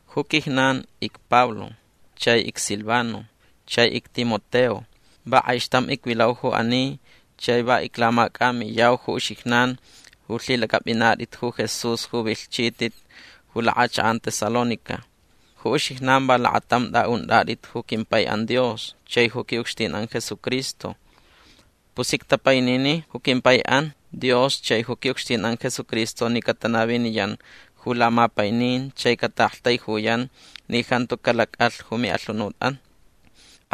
Ju quijnan icPablo chai icSilvano chai icTimoteo. Va kʼaixtam icvilau ju ani chai va iclamacʼamiyau ju uxijnan ju lhilacʼapʼinatʼit ju Jesús ju vilhchitʼit ju lakʼachakʼan Tesalónica. Ju uxijnan va lakatam tʼaʼuntʼatʼit ju quimpaiʼan Dios chai ju quiʼucxtinʼan Jesucristo. Pus ictapainini ju quimpaiʼan Dios chai ju quiʼucxtinʼan Jesucristo ni catanaviniyan ju lamapainin chai cataʼaktaijuyan ni jantu calacʼalh ju miʼalhunutʼan.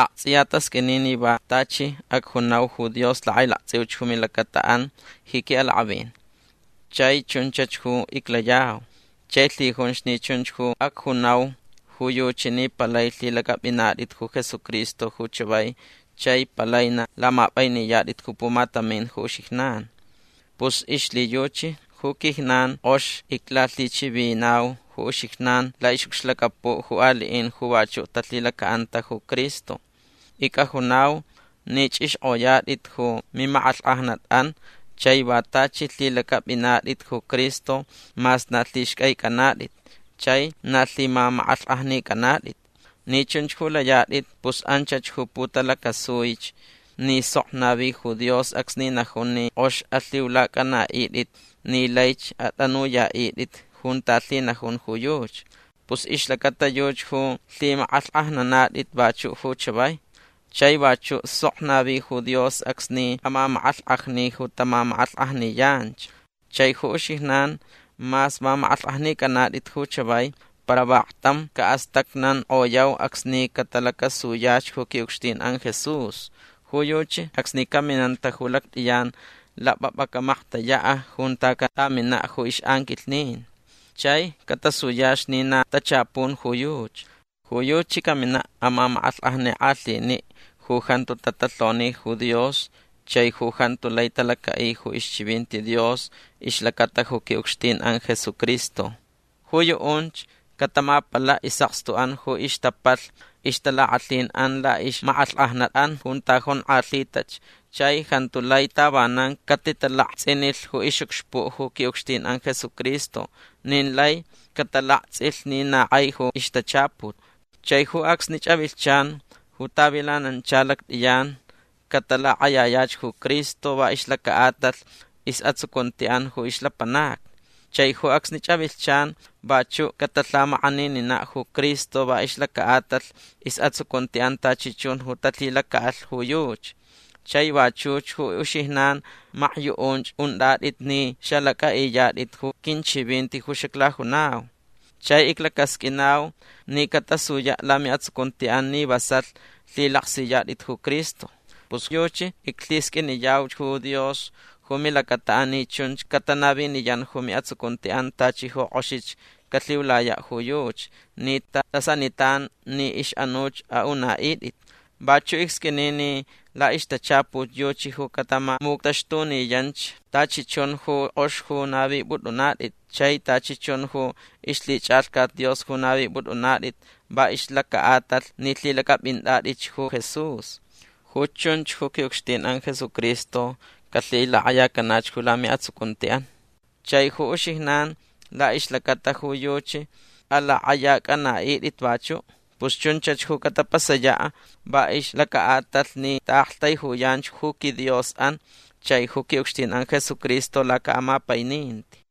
Aktsʼiya tasqʼuini ni va tachi acjunau ju Dios lakʼailaktsʼiuch ju milacataʼan ji quiʼalakʼavin. Chai chunchach ju iclayau. Chai lhijunch ni chunch ju acjunau ju yuchi ni palai lhilacʼapʼinatʼit ju Jesucristo ju chavai chai palai na lamapʼainiyatʼit ju pumatamin ju uxijnan. Pus ixlhiyuchi ju quijnan kʼox iclalhichivinau ju uxijnan laʼixʼucxlacapuʼ ju aliʼin ju vachuʼ talhilacaʼanta ju Cristo. Icʼajunau ni chʼixkʼoyatʼit ju mimakʼalhkʼajnatʼan chai va tachi lhilacʼapʼinatʼit ju Cristo mas na lhixcʼaicʼanatʼit chai na lhimamakʼalhkʼajnicʼanatʼit. Ni chunch ju layatʼit pus anchach ju putalacasuich ni sok navi ju Dios acsni najun ni kʼox alhiulacʼanaʼitʼit ni laich atʼanuyaʼitʼit junta lhinajun ju yuchi. Pus ixlacata yuchi ju lhimakʼalhkʼajnanatʼit vachuʼ ju chavai. Chai vachuʼ sok navi ju Dios acsni amamakʼalhkʼajni ju tamamakʼalhkʼajniyanch. Chai ju uxijnan mas mamakʼalhkʼajnicʼanatʼit ju chavai para vaktam caʼastacnankʼoyau acsni catalacasuyach ju quiʼucxtinʼan Jesús. Ju yuchi acsni caminanta ju lactʼiyan lapʼapʼa camaktayaʼ junta catʼaminaʼ ju ixʼanquilhnin. Chai catasuyach ni na tachapun ju yuchi. Ju yuchi caminaʼ amamakʼalhkʼajnikʼalhiniʼ ju jantu tatalhoni ju Dios chai ju jantu lai talacaʼi ju ixchivinti Dios ixlacata ju quiʼucxtinʼan Jesucristo. Ju yuʼunch catamapalaʼ isʼakstuʼan ju ixtapalh ixtalakʼalhinʼan laʼixmakʼalhkʼajnatʼan junta jonkʼalhitach chai jantu lai tavanan catitalaktsʼinilh ju ixʼucxpuʼ ju quiʼucxtinʼan Jesucristo nin lai catalaktsʼilh ni na kʼai ju ixtachaput. Chai ju acsnich avilhchan ju tavilanancha lactʼiyan catalakʼayayach ju Cristo va ixlacaʼatalh isʼatsucuntiʼan ju ixlapanacni. Chai ju acsnich avilhchan vachuʼ catalhamakʼanininaʼ ju Cristo va ixlacaʼatalh isʼatsucuntiʼan tachi chun ju talhilacaʼalh ju yuchi. Chai vachuch ju uxijnan makyuʼunch untʼatʼit ni xalacʼaʼiyatʼit ju quinchivinti ju xaclajunau. Chai iclacasqʼuinau ni catasuyaʼ lamiʼatsucuntiʼan ni vasalh lhilaksiyatʼit ju Cristo. Pus yuchi iclhisqʼuiniyauch ju Dios ju milacataʼan ni chunch catanaviniyan ju miʼatsucuntiʼan tachi ju kʼoxich calhiulayaʼ ju yuchi ni tatʼasanitan ni ixʼanuch aʼunaʼitʼit. Vachuʼ icsqʼuini ni laʼixtachaput yuchi ju catamamuctaxtuniyanch tachi chun ju kʼox ju navipʼutʼunatʼit chai tachi chun ju ixlhichʼalhcat Dios ju navipʼutʼunatʼit va ixlacaʼatalh ni lhilacʼapʼintʼatʼitch ju Jesús. Ju chunch ju quiʼucxtinʼan Jesucristo calhilakʼayacanach ju lamiʼatsucuntiʼan. Chai ju uxijnan laʼixlacata ju yuchi alakʼayacʼanaʼitʼit vachuʼ. Pus chunch ju catapasayaʼ va ixlacaʼatalh ni taʼaktaijuyanch ju quiDiosʼan chai ju quiʼucxtinʼan Jesucristo lacaʼamapaininti.